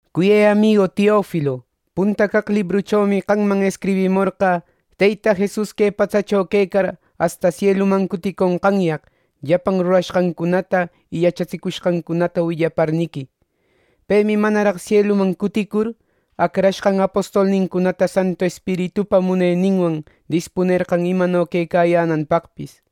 Cuyë amigu Teofilo, punta caq librüchomi qamman escribimorqä Teyta Jesus que patsacho quecar asta sieluman cuticonqanyaq, llapan rurashqancunata y yachatsicushqancunata willaparniqui. Pemi manaraq sieluman cuticur, acrashqan apostolnincunata Santu Espiritupa muneninwan dispunerqan imano quecayänanpaqpis.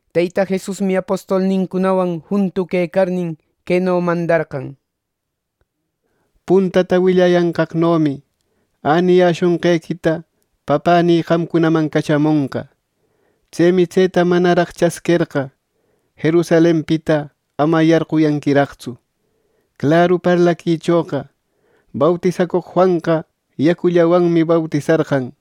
Teyta Jesusmi apostolnincunawan juntu quecarnin, queno mandarqan: —Puntata willayanqaqnomi äniyäshonqequita Papänï qamcunaman cachamonqa. Tsemi tseta manaraq chasquerqa, Jerusalenpita ama yarquyanquiraqtsu. Claru parlaquichoqa bautisacoq Juanqa yacullawanmi bautisarqan;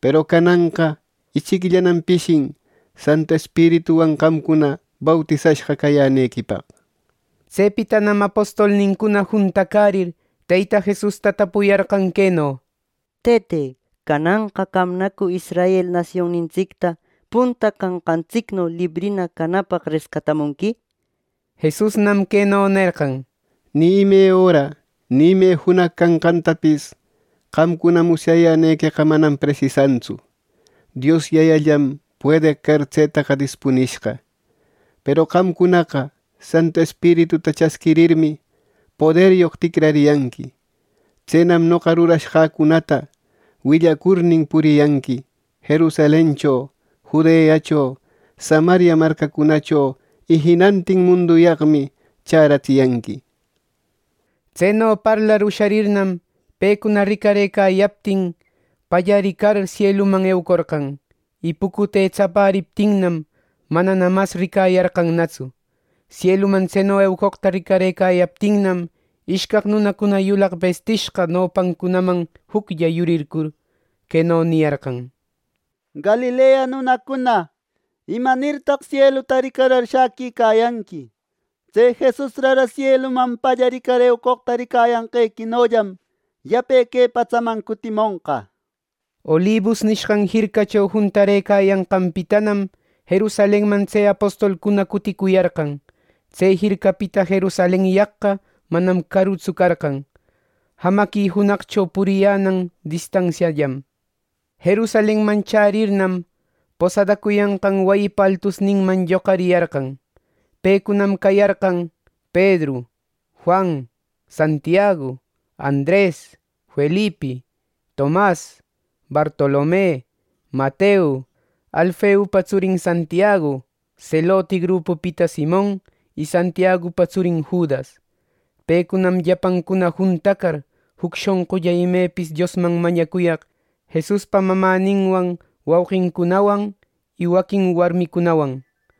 peru cananqa ichicllanam pishin Santu Espirituwan qamcuna bautisashqa cayänequipaq. Tsepitanam apostolnincuna juntacärir, Teyta Jesusta tapuyarqan queno: —Tëte, ¿cananqa qamnacu Israel nasionnintsicta punta canqantsicno librina canapaq rescatamunqui? —nishpa. Jesusnam queno nerqan: —Ni ime öra ni ime junaq canqantapis qamcuna musyayänequeqa manam presisantsu. Dios Yayallam puedeq car tsetaqa dispunishqa. Peru qamcunaqa Santu Espirituta chasquirirmi, poderyoq ticrariyanqui. Tsenam noqa rurashqäcunata willacurnin, puriyanqui Jerusalencho, Judeacho, Samaria marcacunacho; y jinantin munduyaqmi chäratsiyanqui. Tseno parlar usharirnam, pecuna ricarëcayaptin, pallaricar sieluman eucorqan; y pucute tsapäriptinnam, manana mas ricayarqannatsu. Sieluman tseno eucoqta ricarëcayaptinnam, ishcaq nunacuna yulaq bestishqa nopancunaman juclla yurircur, queno niyarqan: —Galilea nunacuna, ¿imanirtaq sieluta ricarar shäquicayanqui! Tse Jesus rara sieluman pallaricar eucoqta ricayanqequinollam, yape que patsaman cutimonqa. Olibus nishqan jircacho juntarëcayanqanpitanam, Jerusalenman tse apostolcuna cuticuyarqan. Tse jircapita Jerusalenyaqqa manam carutsu carqan, jamaqui junaqcho puriyänan distansiallam. Jerusalenman chärirnam, posadacuyanqan wayipa altusninman lloqariyarqan. Pecunam cayarqan: Pedru, Juan, Santiagu, Andres, Felipi, Tomas, Bartolome, Mateo, Alfeupa tsurin Santiagu, Seloti grupupita Simon, y Santiagupa tsurin Judas. Pecunam llapancuna juntacar, juc shonqulla imepis Diosman mañacuyaq Jesuspa mamäninwan wauqincunawan y waquin warmicunawan.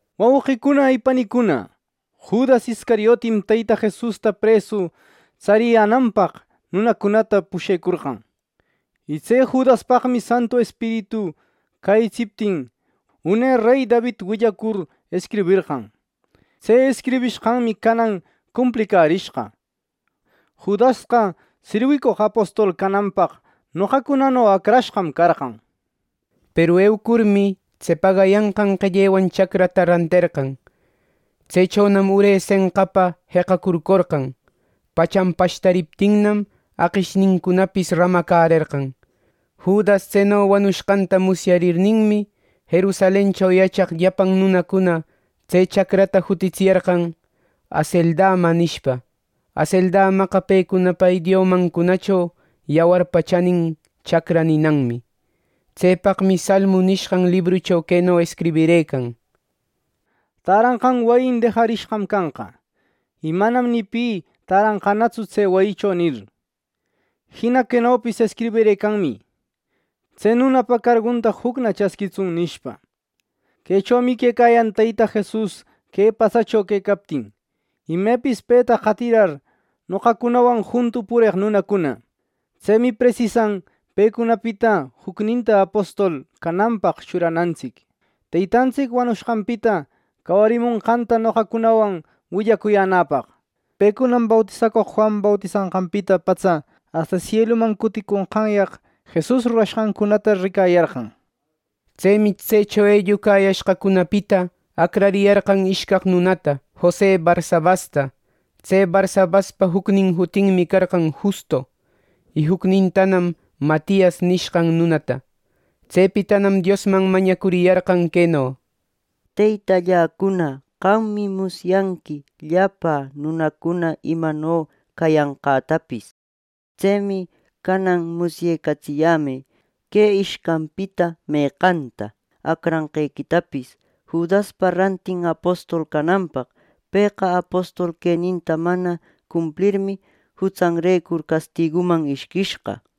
“Wauqicuna y panicuna, Judas Iscariotim Teyta Jesusta presu tsariyänanpaq nunacunata pushecorqan. Y tse Judaspaqmi Santu Espiritu cäyitsiptin, une rey David willacur escriberqan. Tse escribishqanmi canan cumplicärishqa. Judasqa sirwicoq apostol cananpaq noqacunano acrashqam carqan. (Peru eucurmi, tse pagayanqan qellewan chacrata ranterqan. Tsechonam ure senqapa jeqacurcorqan. Pachan pashtariptinnam aqishnincunapis ramacärerqan. Judas tseno wanushqanta musyarirninmi, Jerusalencho yachaq llapan nunacuna tse chacrata jutitsiyarqan ‘Haceldama’ nishpa. Haceldamaqa pecunapa idiomancunacho ‘yawarpa chanin chacra’ ninanmi.) Tsepaqmi Salmu nishqan librucho queno escribirëcan: ‘Täranqan wayim dejarishqa canqa; y manam ni pi täranqanatsu tse wayicho’, nir. Jina quenopis escribirëcanmi: ‘Tse nunapa cargunta jucna chasquitsun’, nishpa. “Quechomi quecayan Teyta Jesus que patsacho quecaptin, imepis peta qatirar, noqacunawan juntu pureq nunacuna. Tsemi presisan pecunapita jucninta apostol cananpaq churanantsic, Teytantsic wanushqanpita cawarimonqanta noqacunawan willacuyänäpaq. Pecunam bautisacoq Juan bautisanqanpita patsa asta sieluman cuticonqanyaq Jesus rurashqancunata ricayarqan.” Tsemi tsecho ellucayashqacunapita acrariyarqan ishcaq nunata: Jose Barsabasta (tse Barsabaspa jucnin jutinmi carqan Justo), y jucnintanam Matias nishqan nunata. Tsepitanam Diosman mañacuriyarqan queno: —Teytalläcuna, qammi musyanqui llapä nunacuna imano cayanqätapis. Tsemi canan musyecatsiyämë, que ishcanpita meqanta acrarenqequitapis Judaspa rantin apostol cananpaq. Pëqa apostol queninta mana cumplirmi, jutsanrecur castiguman ishquishqa.